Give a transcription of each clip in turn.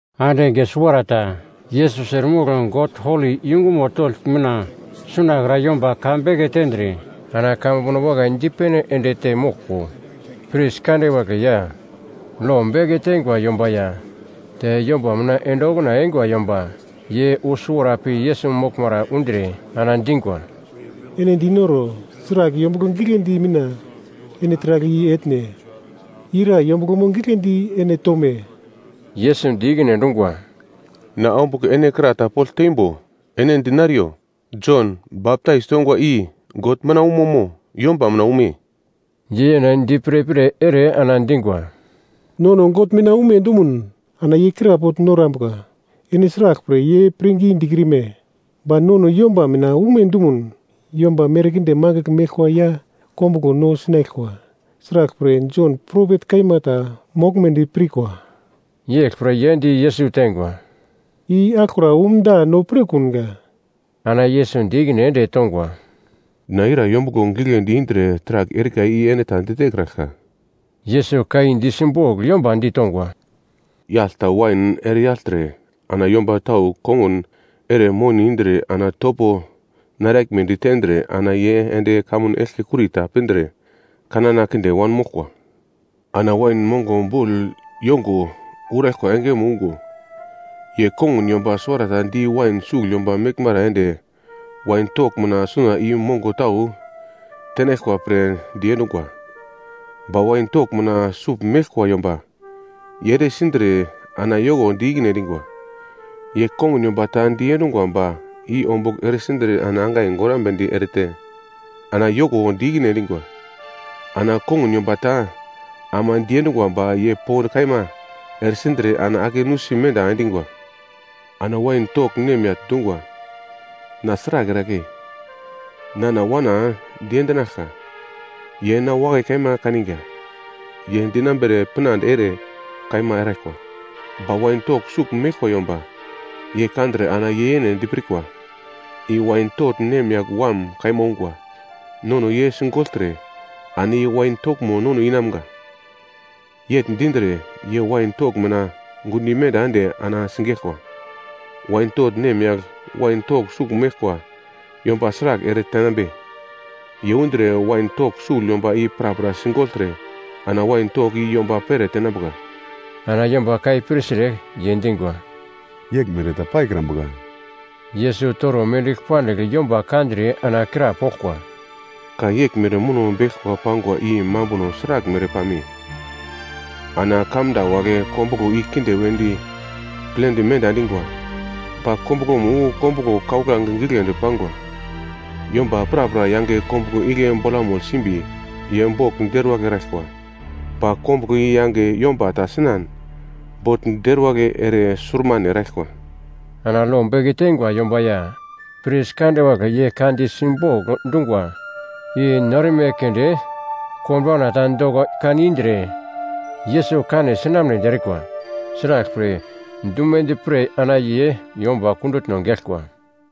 Ande enge suwarata, Yesus eremogl God holi yungumo togl mina sunakra yomba ka beke tendre, ana kamambuno wakai dipene ende te moglko, pris kande wagle ya lo beke teingwa yomba ya te yomba mina ende okuna eingwa yomba, ye wu suwara pi Yesus moglmara undre, ana dingwa, “Ene dinoro, sragl yombuglo gigledi mina ene taragl i etne? Ira yombuglo gigledi ene tome?” Yesus di ikine endungwa, “Na ombugl ene kra ta pogl teimbo ene dinariyo. Jon, baptais tongwa i God mina umo mo yomba mina ume?” Ye yene di pirpir ere ana dingwa, “Nono God mina ume dumun, ana ye krapogl norambuka, ‘Ene sraglpre ye pirngi dikrime?’ Ba nono yomba mina ume dumun, yomba merkinde mangigl meglkwa ya kombuglo no sinaglkwa. Sraglpre, Jon, propet kaima ta moglmedi pirkwa.” Yeglpre ye di Yesus teingwa, “I aglokra umda no pirkunga.” Ana Yesus di ikine ende tongwa, “Na ira yombuglo gigledi indre taragl erika i ene ta ditekraglka.” Yesus ka i di simbogl yomba ditongwa, “Yagl ta wain ere yagltre, ana yomba tau kongun ere moni indre ana na topo naraglmedi tendre ana ye ende kamun eglke kurita pindre kanana kinde wanmoglkwa. Ana wain mongo bogl yongo uraglkwa engemo ungo, ye kongun yomba suwarata di wain sugl yomba meglmara ende wain togl mina suna i mongo tau tenaglkwa pre diendungwa. Ba wain togl mina sugl meglkwa yomba, ye ere sindre ana yoko di ikine endingwa. Ye kongun yomba ta diendungwa ba i ombugl eresindre ana angai gorambedi erete, ana yoko di ikine endingwa. Ana kongun yomba ta ama diendungwa ba ye pond kaima eresindre, ana ake menda endingwa. “Ana wain togl nemyagl dungwa, ‘Na sragl eragle? Nana wana diendinaglka, ye na wakai kaima kaninga, ye dinambere pinande ere kaima eraglkwa.’ “Ba wain togl sugl meglkwa yomba, ye kandre ana ye yene dipirkwa, ‘I wain togl nemyagl wam kaima ungwa. Nono ye sigogltre, ana ye wain toglmo nono inamga.’ Yegl dindre, ye wain togl mina gundo imenda ende ana sigeglkwa. “Wain togl nemyagl wain togl sugl meglkwa yomba sragl ere tenambe? Ye undre wain togl sugl yomba i prapra sigogltre ana wain togl i yomba pere tenambuka.” Ana yomba ka i pirtre, ye dingwa, “Yeglmere ta paikrambuka!” Yesus toro mendigl pandigl yomba kandre ana krapoglkwa, “Ka yeglmere muno beglkwa pangwa i mambuno sraglmere pame? “‘Ana kamda wagle kombuglo i kinde wedi plendi menda endingwa. Ba kombuglomo wu kombuglo kauglange giglendi pangwa.’ Yomba prapra yange kombuglo igle bolamugl simbi ye bogl deruwagl eraglkwa, ba kombuglo i yange yomba ta sinan, bogl deruwagl ere surmane eraglkwa.” Ana lo beke teingwa yomba ya pris kande wagle ye ka di simbogl dungwa i no erme keunde konbauna ta doko kan indre Yesus kane sinamnedi erikwa. Sraglpre, dumedi pre ana ye yomba kundutno geglkwa.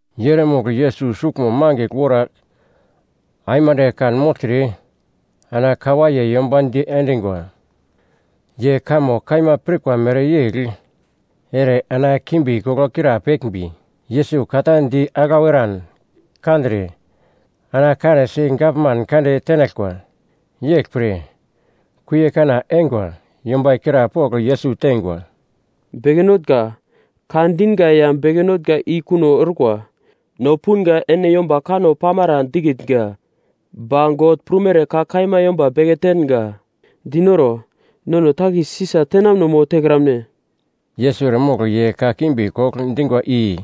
Ye eremogl Yesus suglmo mangigl wora aimande kanmogltre ana ka waiye yomba diendingwa. Ye kamo kaima pirkwa mereyegl ere ana kimbi-koglo krapeglmbi Yesus ka ta di aglau eran kandre, ana kanesi gavman kande tenaglkwa. Yeglpre, kuie kana eingwa yomba i krapogl Yesus teingwa, “Beke Notnga, ka dinga ya beke notnga i kuno orkwa, no punga ene yomba kanno pamara dikitnga, ba God prumere ka kaima yomba beke tenga. Dinoro, nono takis Sisa tenamuno mo tekramne?” Yesus eremogl ye kakimbi kogl dingwa i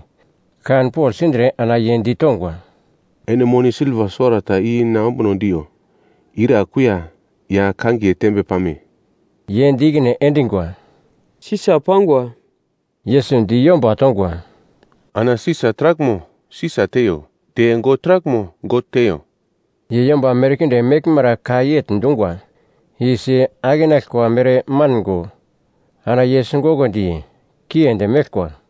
kanpogl sindre ana ye ditongwa, “Ene moni silva suwarata i na ombuno diyo, ira kuiya ya kangiye tembe pame?” Ye di ikine endingwa, “Sisa pangwa.” Yesus di yomba tongwa, “Ana Sisa taraglmo Sisa teiyo, te God taraglmo God teiyo.” Ye yomba merkinde meglmara ka yegl dungwa i si akenaglkwa mere mango. Ana ye singokondi, kiendi meglkwa.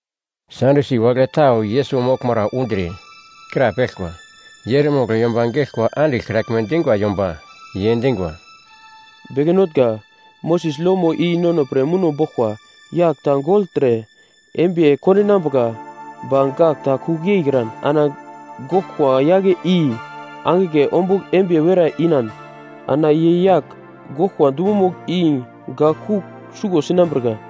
Sadyusi wagle tau Yesus moglmara undre, krapeglkwa. Ye eremogl yomba geglkwa andiglkraglme dingwa yomba. Ye dingwa, “Beke Notnga, Moses lomo i nono pre muno boglkwa: Yagl ta gogltre, embiye kondinambuka ba gak ta kugl yeikran, ana goglkwa yagle i angigle ombugl embiye werai inan, ana ye yagl goglkwa dumomugl i gak kugl suglo sinambirka.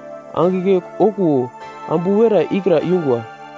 Angigle okuwo ambu werai ikra yungwa.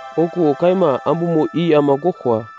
Okuwo kaima ambumo i ama goglkwa.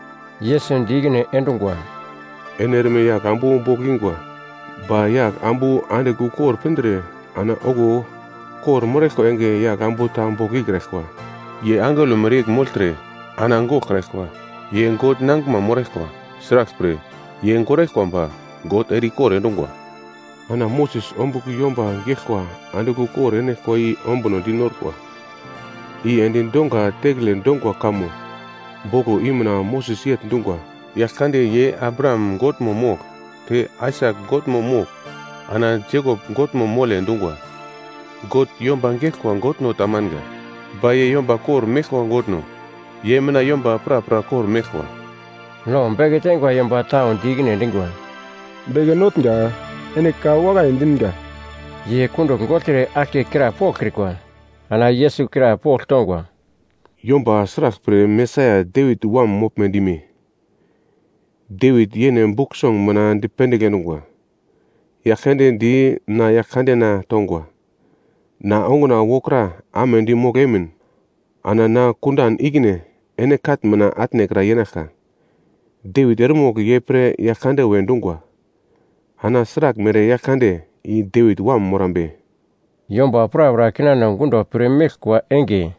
Yesus di ikine endungwa, “Ene erme yagl ambu bogl ingwa. Ba yagl ambu andigl ukor pindre, ana okuwo kor-moraglkwa enge yagl ambu ta bogl ikraglkwa. Ye angelo meglmere yegl mogltre ana goglkraglkwa. Ye God nangiglma moraglkwa. Sraglpre, ye goglkwa ba God ere-ikor endungwa. Ana Moses ombugl yomba geglkwa andigl ukor enaglkwa i ombunodi norkwa. I endi donga tekele dongwa kamo boglo i mina Moses yegl dungwa, ‘Yaglkande ye Abraham Godmo mogl, te Aisak Godmo mogl, ana Jekop Godmo moglkwa dungwa.’ God yomba geglkwa Godno tamanga, ba ye yomba kor-meglkwa Godno. Ye mina yomba prapra kor-meglkwa.” Lo beke teingwa yomba tau di ikine endingwa, “Beke Notnga, ene ka wakai dinga!” Ye kundugl gogltre aglke krapoglkrikwa. Ana Yesus krapogl tongwa, “Yomba sraglpre Mesaia Devit Wam moglme dime? Devit yene Buk Song mina dipendigl endungwa: “‘Yaglkande di na Yaglkandena tongwa, “Na onguna wokra amedi mogl emin, ana na kundan ikine ene katn mina atnekra yenaglka.” ’ Devit eremogl ye pre ‘Yaglkande’ we dungwa, ana sraglmere Yaglkande i Devit wam morambe?” Yomba prapra kinano gundo pir meglkwa enge,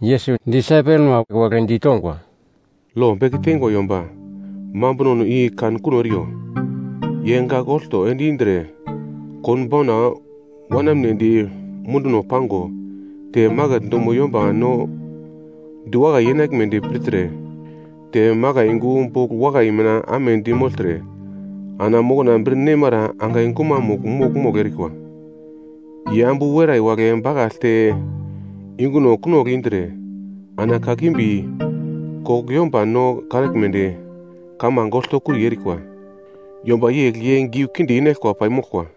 Yesus disaipelma wagle ditongwa, “Lo beke teingwa yomba mambunono i kan kuno eriyo, ye gagl olto ende indre konbauna wanamnedi munduno pango, te maket dumo yomba no diwakai yenaglmedi pirtre, te makai yungu bogl wakai mina amedi mogltre, ana mokna bir nemara angai gumamugl mogl-mogl erikwa. Ye ambu werai wagle bakaglte yunguno kunogl indre, ana kakimbi kogl yomba no kanaglmedi, kamange oltokuri erikwa. Yomba yegl ye giu kinde inaglkwa paimoglkwa.”